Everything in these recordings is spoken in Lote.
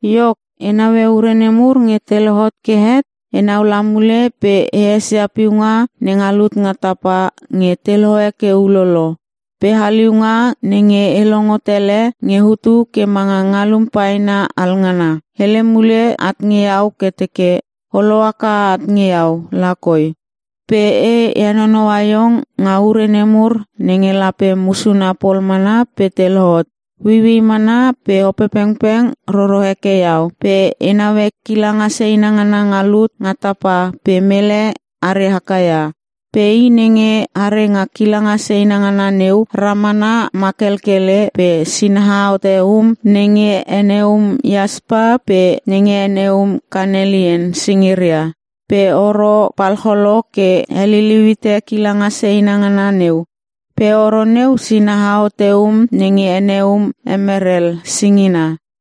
Iok, e naue ure nemur nge te lohot ke het, enau la mule pe e esia piunga nenga lut nga tapa nge te lohe ke ulolo. Pe haliunga nenge e longo tele nge hutu ke manga ngalum paena alngana, hele mule at nge iau ke teke, “O lohaka at nge iau lakoi. Pe e henonoua iong nga ure nemur nenge lape musuna pol mana pe te lohot.” Ueiuei mana pe Opepengpeng roro heke iau pe e naue kilanga seina ngana nga lut nga tapa pe mele are haka ia. Pe I nenge are nga kilanga seina ngana neu ramana makelkele pe sinaha hote um nenge ene um iaspa pe nenge ene um kanelian singiria. Pe oro palcholo ke heliliu hite kilanga seina ngana neu. Pe oro neu sinaha hote um nenge ene um emerel singina.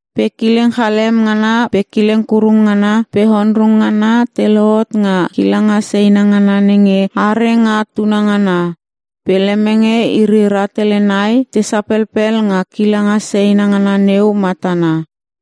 Pe kileng chalem ngana pe kileng kurung ngana pe onrung ngana te lohot nga kilanga seina ngana nenge are nga tunangana. Pe lemenge iri rahtele nai te sapelpel nga kilanga seina ngana neu matana.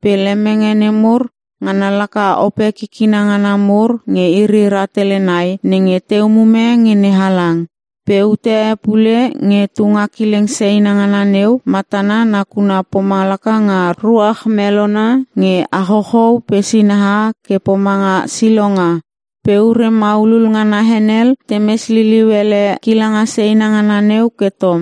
Pe lemenge nemur, ngana laka ope kikina ngana mur nge iri rahtele nai nenge te umume nge NeHalang. Pe ute e pule nge tunga kilanga seina ngana neu matana nakuna pomalaka nga ruach melona nge achouchou pe sinaha ke pomanga silonga. Pe ure maulul ngana henel temes liliu ele kilanga seina ngana neu ke tom.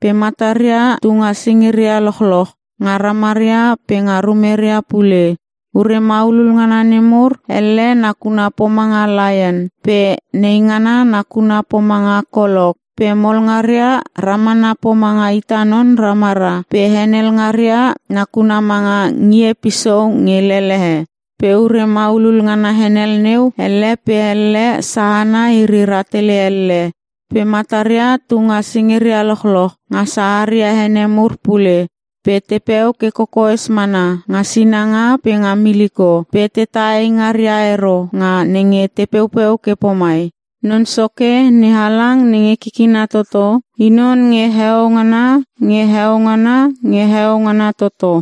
Pe mataria tunga singiria lochloch (nga ramaria pe nga rumeria pule). Ure maulul ngana nemur, elle nakuna pomanga laion pe neingana nakuna pomanga kolok. Pe mol ngaria ramana pomanga ita non ramara pe henel ngaria nakuna manga ngie pisou nge lelehe. Pe ure maulul ngana henel neu, elle pe elle sahana iri rahtele elle. Pe mataria tunga singiria lochloch (nga saharia ene mur pule). Pe tepeu ke kokoes mana nga sinanga pe nga miliko pe tetah eingaria ero nga nenge te peupeu ke pomai, “Non Soke NeHalang nenge Kikina Toto I non nge Heo Ngana nge Heo Ngana nge Heo Ngana toto.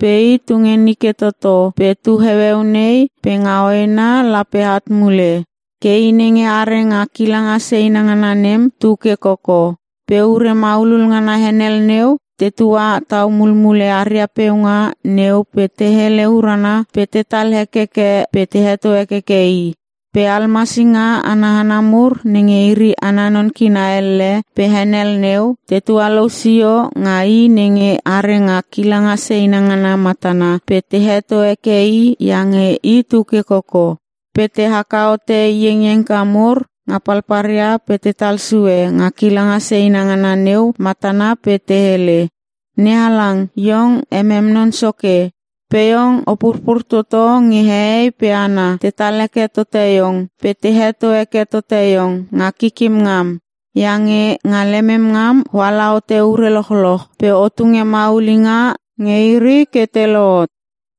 Pe I tu nge nike toto pe tu heueu nei pe nga hoena lape at mule.” Ke I nenge are nga kilanga seina ngana nem tuke koko. Pe ure maulul ngana henel neu, tetua tau mulmule aria peunga neu pe te hele urana pe tetal hekeke pe te heto hekeke I. Pe almasinga ana hana mur nenge iri ana non kina elle pe henel neu te tualou sio nga I nenge are nga kilanga seina ngana matana pe te heto heke I iange I tuke koko. Pe te haka hote iengiengka mur nga palpalria pe tetal sue nga kilanga seina ngana neu matana pe te hele, “NeHalang, Iong emem Non Soke. Pe Iong O purpur toto nge hehei pe hana tetal heke tote Iong pe te heto heke tote Iong nga kikim ngam. Iange nga lemem ngam oala hote ure lochloch pe o tunge maulinga nge iri ke te lohot.”